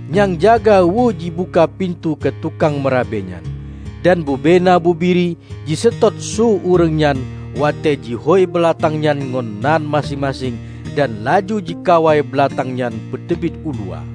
Nyang jaga weue jibuka pintoe keu tukang meurabe nyan, dan bubena bubiri jiseutôt su ureuëng nyan watée jihôi beulatang nyan ngon nan maséng-maséng dan laju jikawai beulatang nyan peuteubiet uluwa.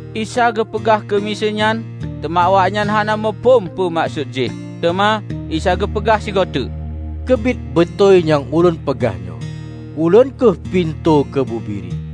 Isa geupeugah keumiseue nyan, teuma awaknyan hana muphom peue meukeusut jih. Teuma Isa geupeugah sigoe teuk, "Keubiet beutôi nyang ulôn peugah nyoe: Ulôn kheueh pintoe keu bubiri.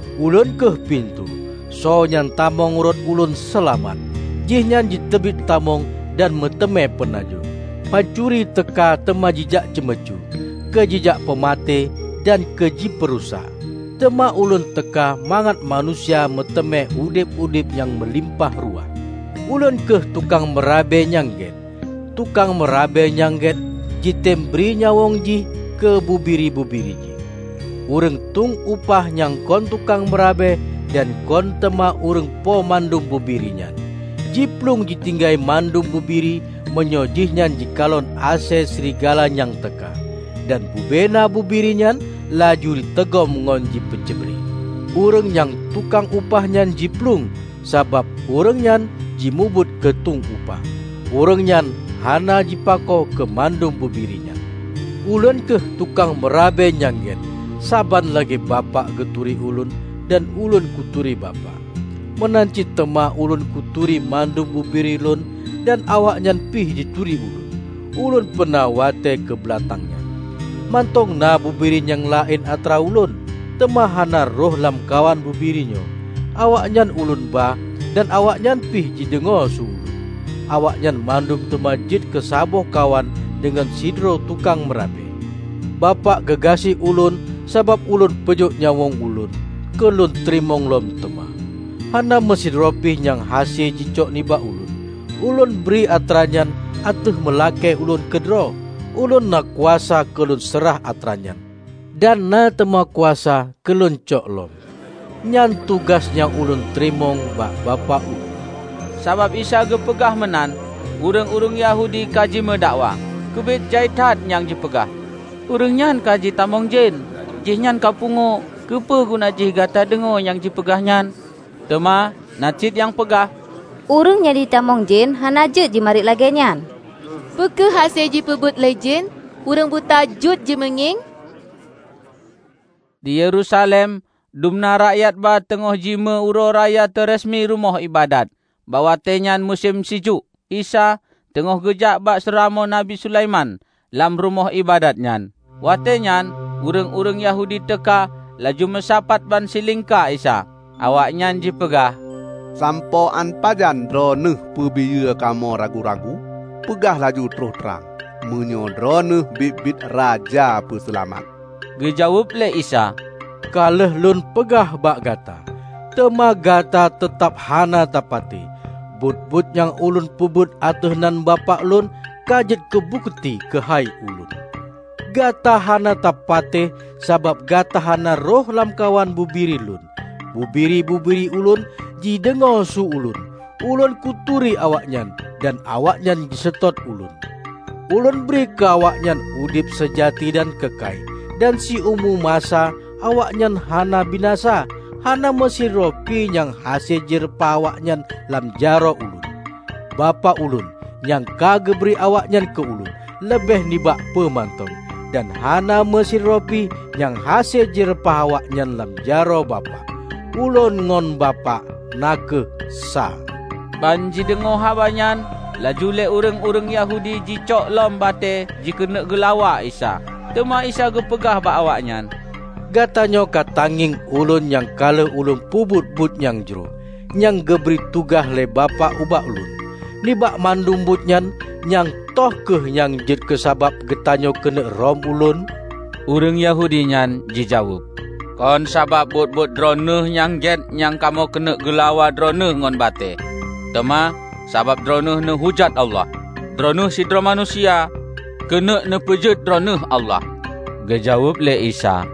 Ulôn kheueh pintoe, soe nyang tamong rot ulôn seulamat; jihnyan jiteubiet tamong dan meuteumé peunajoh. Pancuri teuka teuma jijak ceumeucue, keu jijak peumaté dan keu jipeurusak. Teuma ulôn teuka mangat manusia meuteumé udeb-udeb nyang meulimpah ruah. Ulôn kheueh tukang meurabe nyang gét. Tukang meurabe nyang gét jitem bri nyawöng jih keu bubiri-bubiri jih. Ureuëng tung upah nyang kon tukang meurabe dan kon teuma ureuëng po mandum bubiri nyan, jiplueng jitinggai mandum bubiri meunyoe jihnyan jikalon asée srigala nyang teuka. Dan bubena bubiri nyan laju jiteugom ngon jipeucrebre. Ureuëng nyang tung upah nyan jiplueng, sabab ureuëng nyan jimubuet keu tueng upah. Ureuëng nyan hana jipako keu mandum bubiri nyan. Ulôn kheueh tukang meurabe nyang gét. Saban lagée Bapak geuturi Ulôn dan Ulôn kuturi Bapak, meunan cit teuma Ulôn kuturi mandum bubiri Lôn dan awaknyan pih jituri Ulôn. Ulôn peuna watée keu beulatang nyan. Mantong na bubiri nyang laén atra Ulôn, teuma hana rhoh lamkawan bubiri nyoe. Awaknyan Ulôn ba dan awaknyan pih jideungoe su Ulôn. Awaknyan mandum teuma jeuet keu saboh kawan deungon sidroe tukang meurabe. Bapak geugaséh Ulôn sabab Ulôn peujôk nyawöng Ulôn, keu Lôn teurimong lom teuma. Hana meusidroe pih nyang hase jicok nibak Ulôn. Ulôn bri atranyan ateueh meulakée Ulôn keudroe. Ulôn na kuasa keu Lôn seurah atra nyan, dan na teuma kuasa keu Lôn cok lom. Nyan tugaih nyang Ulôn teurimong bak Bapak Ulôn." Sabab Isa geupeugah meunan, ureuëng-ureuëng Yahudi ka jimeudakwa. Keubiet jai that nyang jipeugah, "Ureuëng nyan ka jitamong jén! Jihnyan ka pungoe! Keupeue guna jih gata deungoe nyang jipeugah nyan?" Teuma na cit nyang peugah, "Ureuëng nyang jitamong jén hana jeuet jimarit lagée nyan! Peu kheueh hase jipeubuet lé jén ureuëng buta jeuet jimeungieng?" Di Yerusalem dumna rakyat ba teungoh jimeu Uroe Raya Teureseumi Rumoh Iébadat. Bak watée nyan musém sijuek. Isa teungoh geujak bak seuramoe Nabi Sulaiman lam Rumoh Iébadat nyan, watée nyan ureuëng-ureuëng Yahudi teuka laju meusapat ban silingka Isa. Awaknyan jipeugah, "Sampoe án pajan Droeneueh peubiyeu kamoe ragu-ragu? Peugah laju troh trang, meunyoe Droeneueh biet-biet Raja Peuseulamat." Geujaweueb lé Isa, "Ka lheueh Lôn peugah bak gata, teuma gata teutab hana tapatéh. Buet-buet nyang Ulôn peubuet ateueh nan Bapak Lôn, ka jeuet keu bukeuti keuhai Ulôn. Gata hana tapatéh sabab gata hana rhoh lamkawan bubiri Lôn. Bubiri-bubiri Ulôn jideungoe su Ulôn. Ulôn kuturi awaknyan, dan awaknyan jiseutôt Ulôn. Ulôn bri keu awaknyan udeb seujati dan keukai, dan siumu masa awaknyan hana binasa. Hana meusidroe pi nyang hase jireupah awaknyan lam jaroe Ulôn. Bapak Ulôn, nyang ka geubri awaknyan keu Ulôn, leubeh nibak peue mantong. Dan hana meusidroe pi nyang hase jireupah awaknyan lam jaroe Bapak. Ulôn ngon Bapak na kheueh sa." Ban jideungoe haba nyan laju lé ureuëng-ureuëng Yahudi jicok lom batée jikeuneuk geulawa Isa. Teuma Isa geupeugah bak awaknyan, "Gatanyoe ka tangieng Ulôn nyang ka lheueh Ulôn peubuet buet nyang jroh, nyang geubri tugaih lé Bapak ubak Ulôn. Nibak mandum buet nyan, nyang toh kheueh nyang jeuet keusabab gatanyoe keuneuk rhom ulôn?" Ureuëng Yahudi nyan jijaweueb, "Kon sabab buet-buet Droeneueh nyang gét nyan kamoe keuneuk geulawa Droeneueh ngon batée, teuma sabab Droeneueh neuhujat Allah. Droeneueh sidroe manusia, keuneuk neupeujeuet Droeneueh Allah." Geujaweueb lé Isa,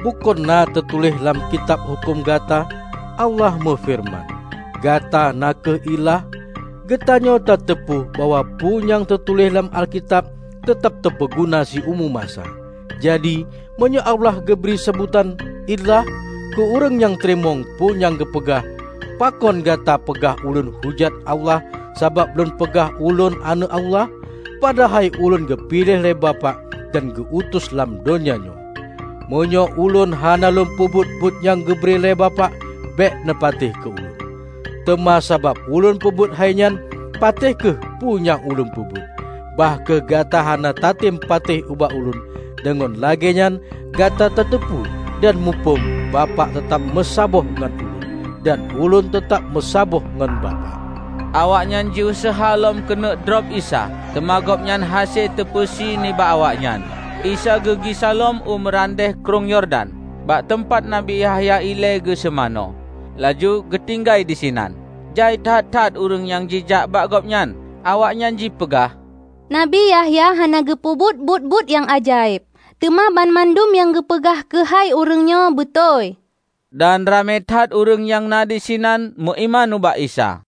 "Bukon na teutuléh lam Kitab Huköm gata: Allah meufeureuman, 'Gata na kheueh ilah'? Geutanyoe ta teupeu bahwa peue nyang teutuléh lam Alkitab teutab teupeuguna siumu masa. Jadi, meunyoe Allah geubri seubutan 'ilah' keu ureuëng nyang teurimong peue nyang geupeugah, pakon gata peugah Ulôn hujat Allah sabab Lôn peugah Ulôn Aneuëk Allah? Padahai Ulôn geupiléh lé Bapak dan geu-utus lam donya nyoe. Meunyoe Ulôn hana lôn peubuet buet nyang geubri lé Bapak, bék neupatéh keu Ulôn. Teuma sabab Ulôn peubuet hainyan, patéh kheueh peue nyang Ulôn peubuet, bah kheueh gata hana tatem patéh ubak Ulôn. Deungon lagée nyan gata tateupeue dan muphom Bapak teutab meusaboh ngon Ulôn, dan Ulôn teutab meusaboh ngon Bapak." Awaknyan jiuseuha lom keuneuk drob Isa, teuma Gobnyan hase teupeusi nibak awaknyan. Isa geugisa lom u meurandeh Krueng Yordan, bak teumpat Nabi Yahya ilée geuseumanö, laju geutinggai disinan. Jai that-that ureuëng nyang jijak bak Gobnyan. Awaknyan jipeugah, "Nabi Yahya hana geupeubuet buet-buet nyang ajaéb, teuma banmandum nyang geupeugah keuhai ureuëng nyoe beutôi." Dan Ramé that ureuëng nyang na disinan meuiman ubak Isa.